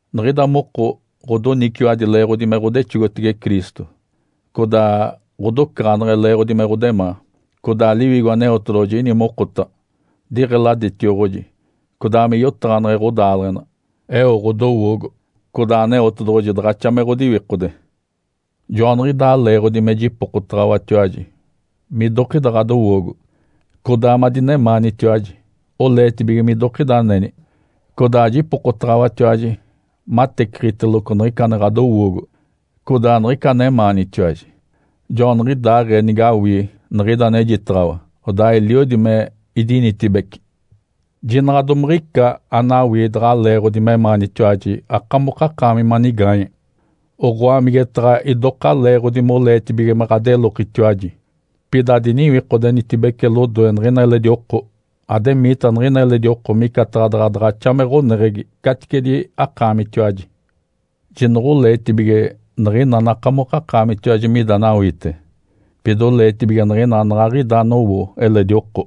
Niɡ̶ida moko ɡ̶odoniciwadi leeɡ̶odi me ɡ̶odexogotege Cristo, codaa ɡ̶odocaɡ̶aneɡ̶e leeɡ̶odi me ɡ̶odemaa, codaa Liwigo Aneotedoɡ̶oji ini mokotaɡ̶a diɡ̶eladetioɡ̶oji codaa me yotaɡ̶aneɡ̶e ɡ̶odaaleɡ̶ena, eo ɡ̶odowoogo, codaa Aneotedoɡ̶oji daɡ̶axa me ɡ̶odiwikode. Joaniɡ̶idaa leeɡ̶odi me jipokotaɡ̶awatiwaji midokida ɡ̶adowoogo, codaa madinemaanitiwaji oleetibige midokida aneni, codaa jipokotaɡ̶awatiwaji mateciɡ̶iteloco niɡ̶ica ane ɡ̶adowoogo codaa niɡ̶ica anemaanitiwaji. Joaniɡ̶idaaɡ̶ee nigawii niɡ̶ida anejitaɡ̶awa, odaa eliodi me idinitibeci. Jinaɡ̶a domaɡ̶a ica anawii daɡ̶a leeɡ̶odi memaanitiwaji akamokakaami manigaanye, oɡ̶oa, migetaɡ̶a idoka leeɡ̶odi moleetibige me ɡ̶adelokitiwaji. Pida adiniwikodenitibece lodoe niɡ̶ina eledi oko, ademiita niɡ̶ina eledi oko micataɡ̶a daɡ̶a daɡ̶axa me ɡ̶oneɡ̶egi caticedi akaamitiwaji. Jinoɡ̶oleetibige niɡ̶ina anakamokakaamitatiwaji mida anawiite, pida oleetibige niɡ̶ina anaɡ̶aɡ̶ida anowo eledi oko.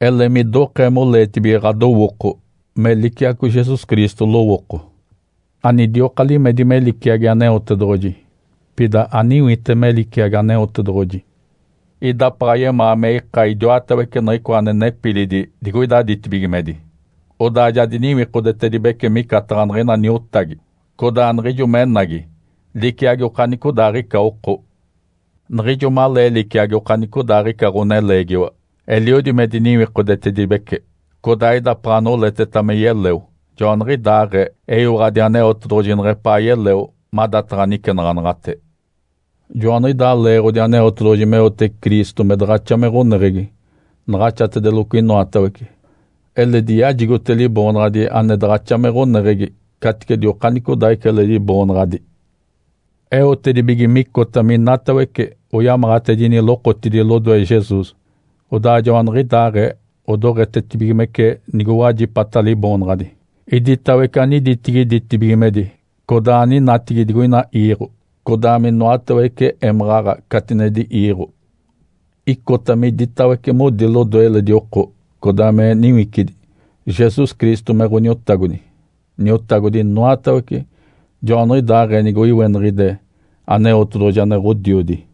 Ele midokee moleetibige ɡ̶adowooko me liciaco Jesus Cristo lowooko. Anidioka limedi me liciagi Aneotedoɡ̶oji, pida ayecewe me liciagi Aneotedoɡ̶oji. Idapaɡ̶a yemaa me ika idiwatawece niɡ̶icoa ane nepilidi digoida ditibigimedi. Odaa ja diniwikodetedibece micataɡ̶a niɡ̶ina niotagi, codaa niɡ̶ijo menagi liciagi okanicodaaɡ̶ica oko. Niɡ̶ijo malee liciagi okanicodaaɡ̶ica ɡ̶oneleegiwa, eliodi me diniwikodetedibece, codaa idapaɡ̶a noleteta me yeleo, joaniɡ̶idaaɡ̶ee eyiwaɡ̶adi Aneotedoɡ̶oji neɡ̶epaa yeleo madataɡ̶a nicenaɡ̶anaɡ̶ate. Joaniɡ̶idaa leeɡ̶odi Aneotedoɡ̶oji meote Cristo me daɡ̶axa me ɡ̶oneɡ̶egi naɡ̶axatedeloco inoatawece, eledi yajigote Liboonaɡ̶adi ane daɡ̶axa me ɡ̶oneɡ̶egi caticedi okanicodaaɡ̶ica eledi boonaɡ̶adi. Eotedibige micota minatawece oyamaɡ̶atedini lokotidi lodoe Jesus, odaa joaniɡ̶idaaɡ̶ee odoɡ̶etetibigimece nigowajipata Liboonaɡ̶adi, iditawece aniditigi ditibigimedi, codaa aninatigi digoina iiɡ̶o, codaa minoatawece émaɡ̶aɡ̶a catinedi iiɡ̶o. Icota miditawece modi lodoe eledi oko codaa me niwicidi, Jesus Cristo me Ǥoniotagodi, Niotagodi inoatawece, joaniɡ̶idaaɡ̶ee nige oiweniɡ̶ide Aneotedoɡ̶oji ane Ǥodiodi.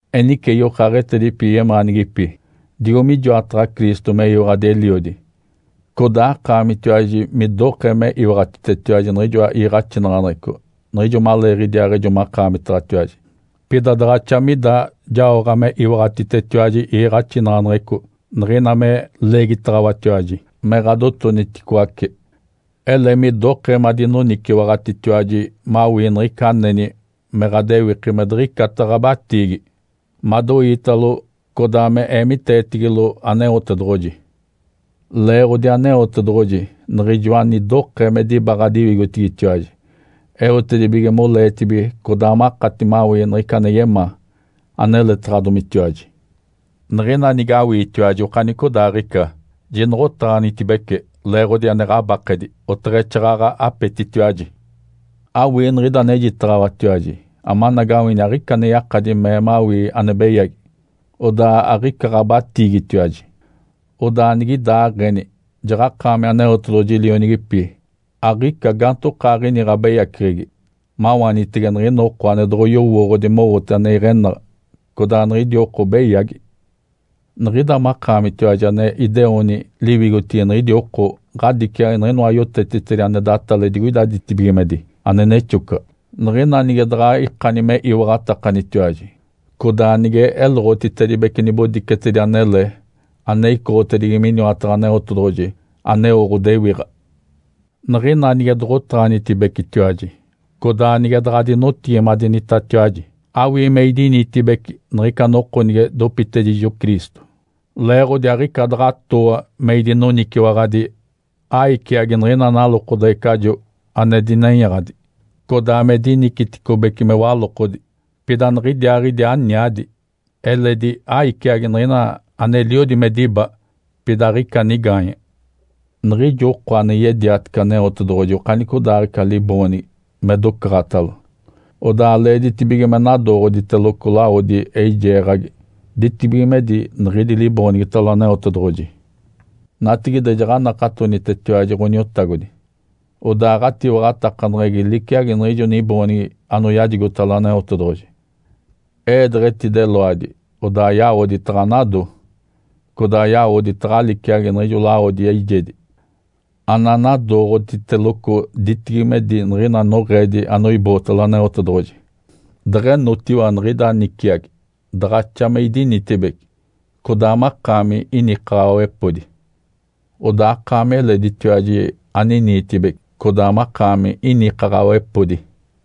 Enice yokaaɡ̶etedipi yemaanigipi, digo mijoataɡ̶a Cristo meyiwaɡ̶adi Eliodi, codaa akaamitiwaji midokee me iwaɡ̶atitetiwaji niɡ̶ijoa iiɡ̶axinaɡ̶aneɡ̶eco niɡ̶ijo maleeɡ̶idiaaɡ̶ejo makaamitaɡ̶atiwaji, pida daɡ̶axa mida jaoɡ̶a me iwaɡ̶atitetiwaji iiɡ̶axinaɡ̶aneɡ̶eco niɡ̶ina me leegitaɡ̶awatiwaji me ɡ̶adotoniticoace. Ele midokee madinoniciwaɡ̶atitiwaji mawii niɡ̶ica aneni me ɡ̶adewiki me diɡ̶icata ɡ̶abatiigi, madoiitalo, codaa me eemiteetigilo Aneotedoɡ̶oji. Leeɡ̶odi Aneotedoɡ̶oji Niɡ̶ijoa anidokee me diba ɡ̶adiwigotigitiwaji, eotedibige moleetibige, codaa makati mawii niɡ̶ica ane yemaa, aneletaɡ̶adomitiwaji. Niɡ̶ina nige awiitiwaji okanicodaaɡ̶ica, jinoɡ̶otaɡ̶anitibece leeɡ̶odi ane ɡ̶abakedi, oteɡ̶exaaɡ̶aɡ̶a apetitiwaji. Awii niɡ̶ida anejitaɡ̶awatiwaji amanagawini aɡ̶ica ane yakadi mee mawii ane beyagi, odaa aɡ̶ica ɡ̶abatiigitiwaji. Odaa nigidaaɡ̶eni jaɡ̶akaami Aneotedoɡ̶oji lionigipi, aɡ̶ica gaantokaaɡ̶ini ɡ̶abeyaceɡ̶egi, mawaanitege niɡ̶ina oko ane doɡ̶oyowooɡ̶odi mowote ane iɡ̶enaɡ̶a, codaa niɡ̶idi oko beyagi. Niɡ̶ida makaamitiwaji ane ideoni liwigotigi niɡ̶idi oko ɡ̶adiciagi niɡ̶inoa yotetitedi ane datale digoida ditibigimedi ane nexocaɡ̶a, niɡ̶ina nige daɡ̶a ikani me iwaɡ̶atakanitiwaji, codaa nige eloɡ̶otitedibece nibodicetedi anele ane icoɡ̶otedigi miniwataɡ̶a Aneotedoɡ̶oji, aneo ɡ̶odewiɡ̶a. Niɡ̶ina nige doɡ̶otaɡ̶anitibecetiwaji codaa nige daɡ̶adinotigimadenitatiwaji, awii me idinitibeci niɡ̶ica noko nige dopitedijo Cristo, leeɡ̶odi aɡ̶ica daɡ̶a atooa me idinoniciwaɡ̶adi, aiciagi niɡ̶ina nalokodeɡ̶ecajo ane dinenyaɡ̶adi, codaa me diniciticobece me walokodi, pida niɡ̶idiaaɡ̶idi aniadi, eledi aiciagi niɡ̶ina aneliodi me diba, pida aɡ̶ica nigaanye. Niɡ̶ijo oko ane yediatece Aneotedoɡ̶oji okanicodaaɡ̶ica liboonigi me docaɡ̶atalo, odaa leeditibige me nadooɡ̶oditeloco lawodi eijeeɡ̶agi ditibigimedi niɡ̶idi liboonigitalo Aneotedoɡ̶oji. Natigide jaɡ̶anakatonitetiwaji Ǥoniotagodi, odaa ɡ̶atiwaɡ̶atakaneɡ̶egi liciagi niɡ̶ijo niboonigi anoyajigotalo Aneotedoɡ̶oji. Ee deɡ̶etideloadi, odaa yawodi taɡ̶anado. Codaa yawodi taɡ̶a liciagi niɡ̶ijoa lawodi eijedi ananadooɡ̶oditeloco ditibigimedi niɡ̶ina noɡ̶eedi anoibootalo Aneotedoɡ̶oji. Deɡ̶enotiwa niɡ̶ida niciagi, daɡ̶axa me idinitibeci, codaa makaami inikaɡ̶awepodi. Odaa akaami eleditiwaji aniniitibeci, codaa makaami inikaɡ̶awepodi.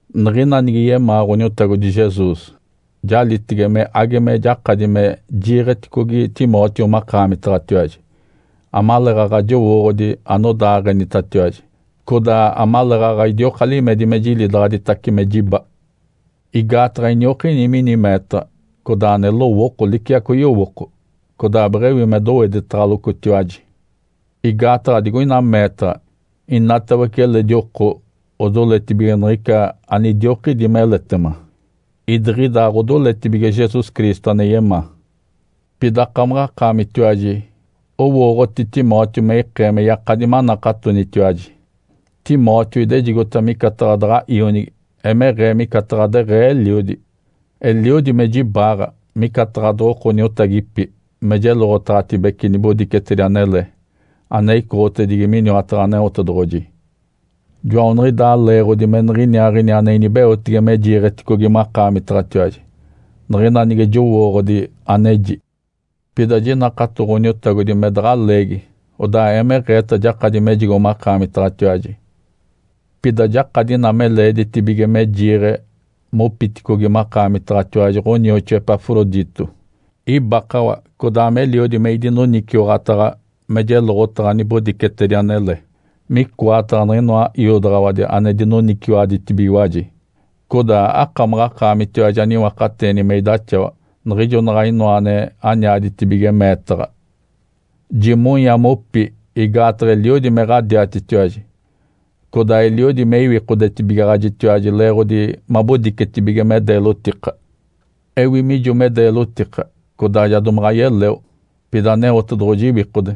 Niɡ̶ina nige yemaa Ǥoniotagodi Jesus, jalitege me age me jakadi me jiiɡ̶eticogi Timóteo makaamitaɡ̶atiwaji, amaleeɡ̶aɡ̶a jowooɡ̶odi anodaaɡ̶enitatiwaji, codaa amaleeɡ̶aɡ̶a idioka limedi me jilidaɡ̶aditace me jiba. Igaataɡ̶a iniokini mini meetaɡ̶a codaa ane lowooko liciaco yowooko, codaa beɡ̶ewi me doweditaɡ̶alocotiwaji. Igaataɡ̶a digoina meetaɡ̶a inatawece eledi oko odoletibige niɡ̶ica anidiokidi meletema, idiɡ̶ida aɡ̶odoletibige Jesus Cristo ane yemaa. Pida akamaɡ̶akaamitiwaji owooɡ̶oti Timóteo me ikee me yakadi manakatonitiwaji. Timóteo idejigota micataɡ̶a daɡ̶a ionigi, emeɡ̶ee micataɡ̶a deɡ̶ee eliodi. Eliodi me jibaaɡ̶a micataɡ̶a doɡ̶oko niotagipi me jeloɡ̶otaɡ̶atedibece nibodicetedi anele ane icoɡ̶otedigi miniwataɡ̶a Aneotedoɡ̶oji. Joaniɡ̶idaa leeɡ̶odi me niɡ̶iniaaɡ̶ini ane inibeotege me jiiɡ̶eticogi makaamitaɡ̶atiwaji, niɡ̶ina nige jowooɡ̶odi aneji. Pida jinakato Ǥoniotagodi me daɡ̶a leegi, odaa emeɡ̶eeta jakadi mejigo makaamitaɡ̶atiwaji. Pida jakadi ina me leeditibige me jiiɡ̶e mopiticogi makaamitaɡ̶atiwaji ɡ̶onioxoa Epafrodito. Ibakawa, codaa meliodi me idinoniciwaɡ̶ataɡ̶a me jeloɡ̶otaɡ̶a nibodicetedi anele, micoataɡ̶a niɡ̶inoa iodaɡ̶awadi ane dinoniciwaɡ̶aditibigiwaji. Codaa akamaɡ̶akaamitiwaji aniwakateeni me idaxawa, niɡ̶ijo naɡ̶a inoa ane aniaditibige meetaɡ̶a. Jimonya mopi igaataɡ̶a eliodi me ɡ̶adiatitiwaji, codaa eliodi me iwikodetibigaɡ̶ajitiwaji leeɡ̶odi mabodicetibige me deelotika. Ewi mijo me deelotika, codaa ja domaɡ̶a yeleo. Pida Aneotedoɡ̶oji iwikode,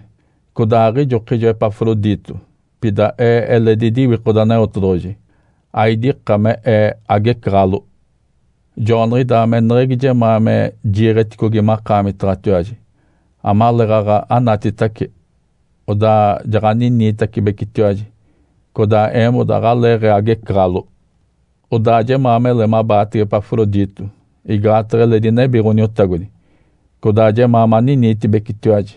codaa aɡ̶ijokijo Epafrodito, pida ee eledi idiwikode Aneotedoɡ̶oji, aidika me ee agecaɡ̶alo. Joaniɡ̶idaa me eneɡ̶egi jemaa me jiiɡ̶eticogi makaamitaɡ̶atiwaji, amaleeɡ̶aɡ̶a anatitace, odaa jaɡ̶aniniitacibecitiwaji, codaa eemoda aɡ̶aleeɡ̶ee agecaɡ̶alo. Odaa jemaa mele mabaatege Epafrodito, igaataɡ̶a eledi nebi Ǥoniotagodi, codaa jemaa maniniitibecitiwaji.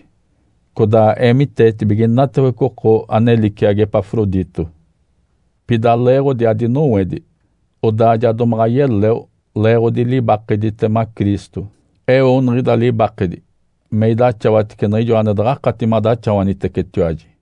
Codaa eemiteetibige inatawece oko ane liciagi Epafrodito. Pida leeɡ̶odi adinowedi, odaa ja domaɡ̶a yeleo leeɡ̶odi libakeditema Cristo. Eo niɡ̶ida libakedi me idaxawatece niɡ̶ijo ane daɡ̶akati madaxawanitecetiwaji.